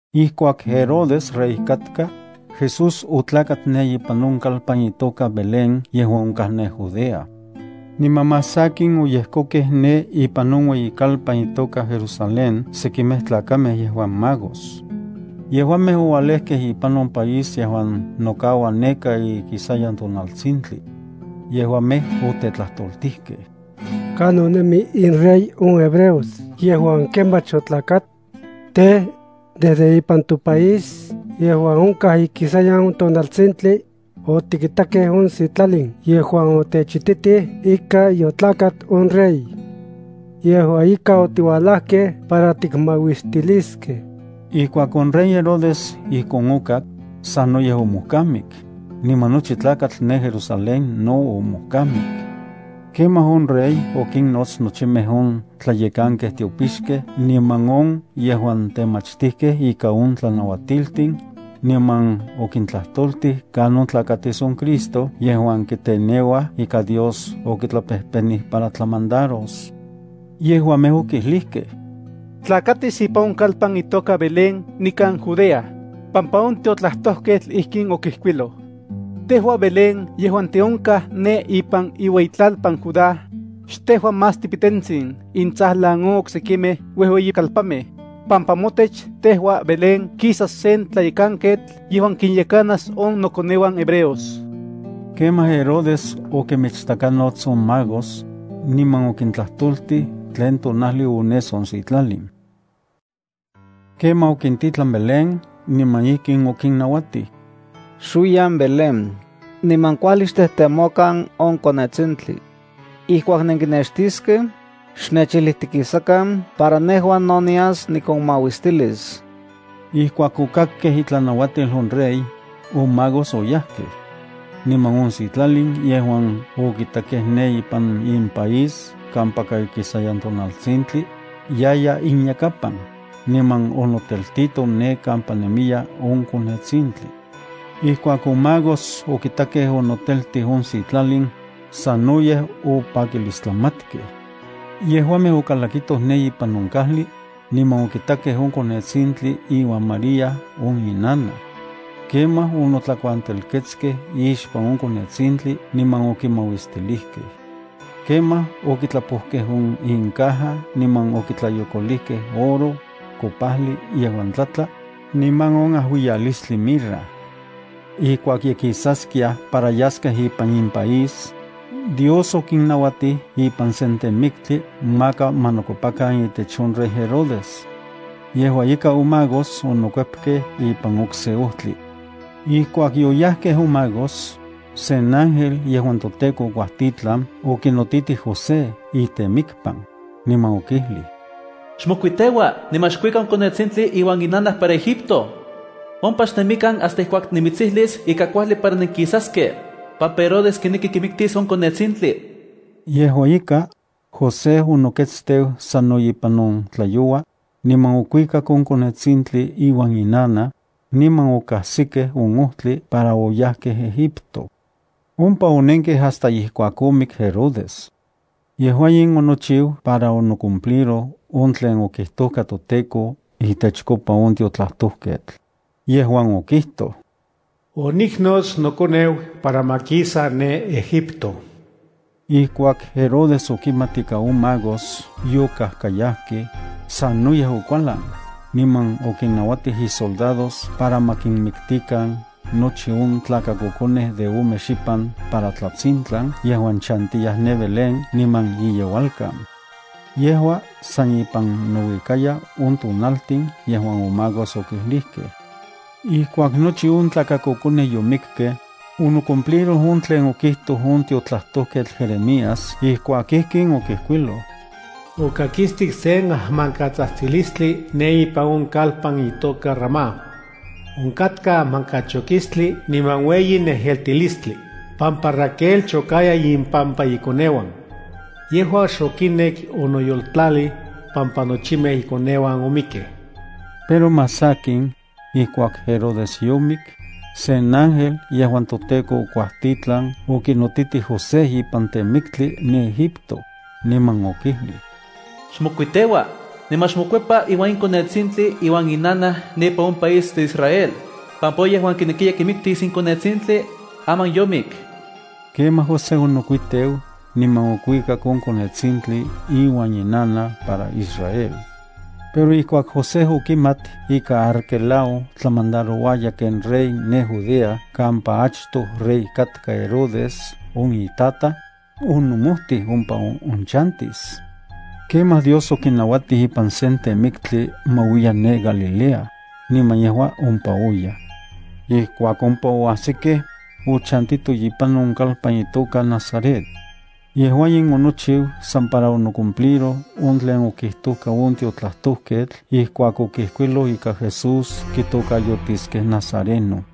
Ijkuak Herodes rey katka, Jesús otlakat ne ipan on kalpan itoka Belén yejuan onkaj ne Judea. Niman más sakin, oyejkokej ne ipan on ueyikalpan itoka Jerusalén sekimej tlakamej yejuan magos. Yejuamej oualejkej ipan on país yejuan nokaua neka ikisayan tonaltsintli. Yejuamej otetlajtoltijkej: —¿Kanon nemi inrey on hebreos yejuan kemach otlakat? Tej, desde ipan topaís yejuan onkaj ikisayan on tonaltsintli, otikitakej on sitlalin yejuan otechititij ika yotlakat on rey. Yejua ika otiualajkej para tikmauistiliskej. Ijkuak on rey Herodes ijkon okak, sanoyej omojkamik, niman nochi tlakatl ne Jerusalén no omojkamik. Kemaj on rey okinnots nochimej on tlayekankej tiopixkej niman on yejuan temachtijkej ikan on tlanauatiltin, niman okintlajtoltij kanon tlakatis on Cristo yejuan kiteneuaj ika Dios okitlapejpenij para tlamandaros. Yejuamej okijlijkej: —Tlakatis ipan on kalpan itoka Belén nikan Judea, pampa on tiotlajtojketl ijkin okijkuiloj: Tejua Belén yejuan tiónkaj ne ipan iueyitlalpan Judá, xtejua más tipitentsin intsajlan on oksekimej uejueyikalpanmej, pampa motech tejua Belén kisas sen tlayekanketl yejuan kinyekanas on nokoneuan hebreos. Kemaj Herodes okinmichtakanots on magos, niman okintlajtoltij tlen tonajli ones on sitlalin. Kemaj okintitlan Belén niman ijkin okinnauatij: —Xuiyan Belén, niman kuajli xtejtemokan on konetsintli. Ijkuak nenkinextiskej, xnechijlijtikisakan para nejua no nias nikonmauistilis. Ijkuak okakkej itlanauatil on rey, on magos oyajkej. Niman on sitlalin yejuan okitakej ne ipan impaís kampaka ikisayan tonaltsintli, yaya inyakapan, niman onoteltito ne kampa nemiya on konetsintli. Ijkuak on magos okitakej onoteltij on sitlalin, sanoyej opakilistlamatkej. Yejuamej okalakitoj ne ipan on kajli, niman okitakej on konetsintli iuan María on inanaj. Kemaj onotlakuantelketskej ixpan on konetsintli niman okimauistilijkej. Kemaj okitlapojkej on incaja niman okitlayokolijkej oro, kopajli yejuan tlatla, niman on ajuiyalistli mirra. Ijkuak ye kisaskiaj para yaskej ipan impaís, Dios okinnauatij ipan sen temiktli maka ma nokuepakan itech on rey Herodes. Yejua ika on magos onokuepkej ipan okse ojtli. Ijkuak yoyajkej on magos, sen ángel yejuan toTEKO okuajtitlan okinotitij José itemikpan, niman okijlij: —Xmokuiteua niman xkuika on konetsintli iuan inanaj para Egipto. Ompa xnemikan hasta ijkuak nimitsijlis kuajli para nenkisaskej, pampa Herodes kineki kimiktis on konetsintli. Yejua ika, José onoketsteu sano ipan on tlayoua, niman okuikak on konetsintli iuan inanaj, niman okajsikej on ojtli para oyajkej Egipto. Ompa onenkej hasta ijkuak omik Herodes. Yejua in onochiu para onocumpliroj on tlen okijtojka toTEKO itechkopa on tiotlajtojketl yejuan okijtoj: “Oniknots nokoneu para ma kisa ne Egipto.” Ijkuak Herodes okimat ika on magos yokajkayajkej, sanoyej okualan, niman okinnauatij isoldados para ma kinmiktikan nochi on tlakakokonej de ome xipan para tlatsintlan yejuan chantiyaj ne Belén niman iyeualkan. Yejua san ipan nouikaya on tonaltin yejuan on magos okijlijkej. Ijkuak nochi on tlakakokonej yomikkej, onocumpliroj tlen okijtoj on tiotlajtojketl Jeremías ijkuak ijkin okijkuiloj: Okakistik sen ajmankatsajtsilistli ne ipan on kalpan itoka Ramá. Onkatka ajmankachokistli niman ueyi nejeltilistli, pampa Raquel chokaya impampa ikoneuan. Yejua xokinek onoyoltlalij, pampa nochimej ikoneuan omikkej. Pero más sakin, ijkuak Herodes yomik, sen ángel yejuan toTEKO okuajtitlan okinotitij José ipan temiktli ne Egipto, niman okijlij: —Xmokuiteua, niman xmokuepa iuan on konetsintli iuan inanaj ne ipan on mopaís de Israel, pampa on yejuan kinekiya kimiktis in konetsintli, aman yomik. Kemaj José onokuiteu niman okuikak on konetsintli iuan inanaj para Israel. Pero ijkuak José okimat ika Arquelao tlamandarouaya ken rey ne Judea kampa achtoj rey katka Herodes on itataj, onomojtij ompa onchantis. Kemaj Dios okinauatij ipan sen temiktli ma uiya ne Galilea, niman yejua ompa oyaj. Ijkuak ompa oajsikej, ochantitoj ipan on kalpan itoka Nazaret. Yejua in onochiu san para onocumpliroj on tlen okijtojka on tiotlajtojketl ijkuak okijkuiloj ika Jesús kitokayotiskej nazareno.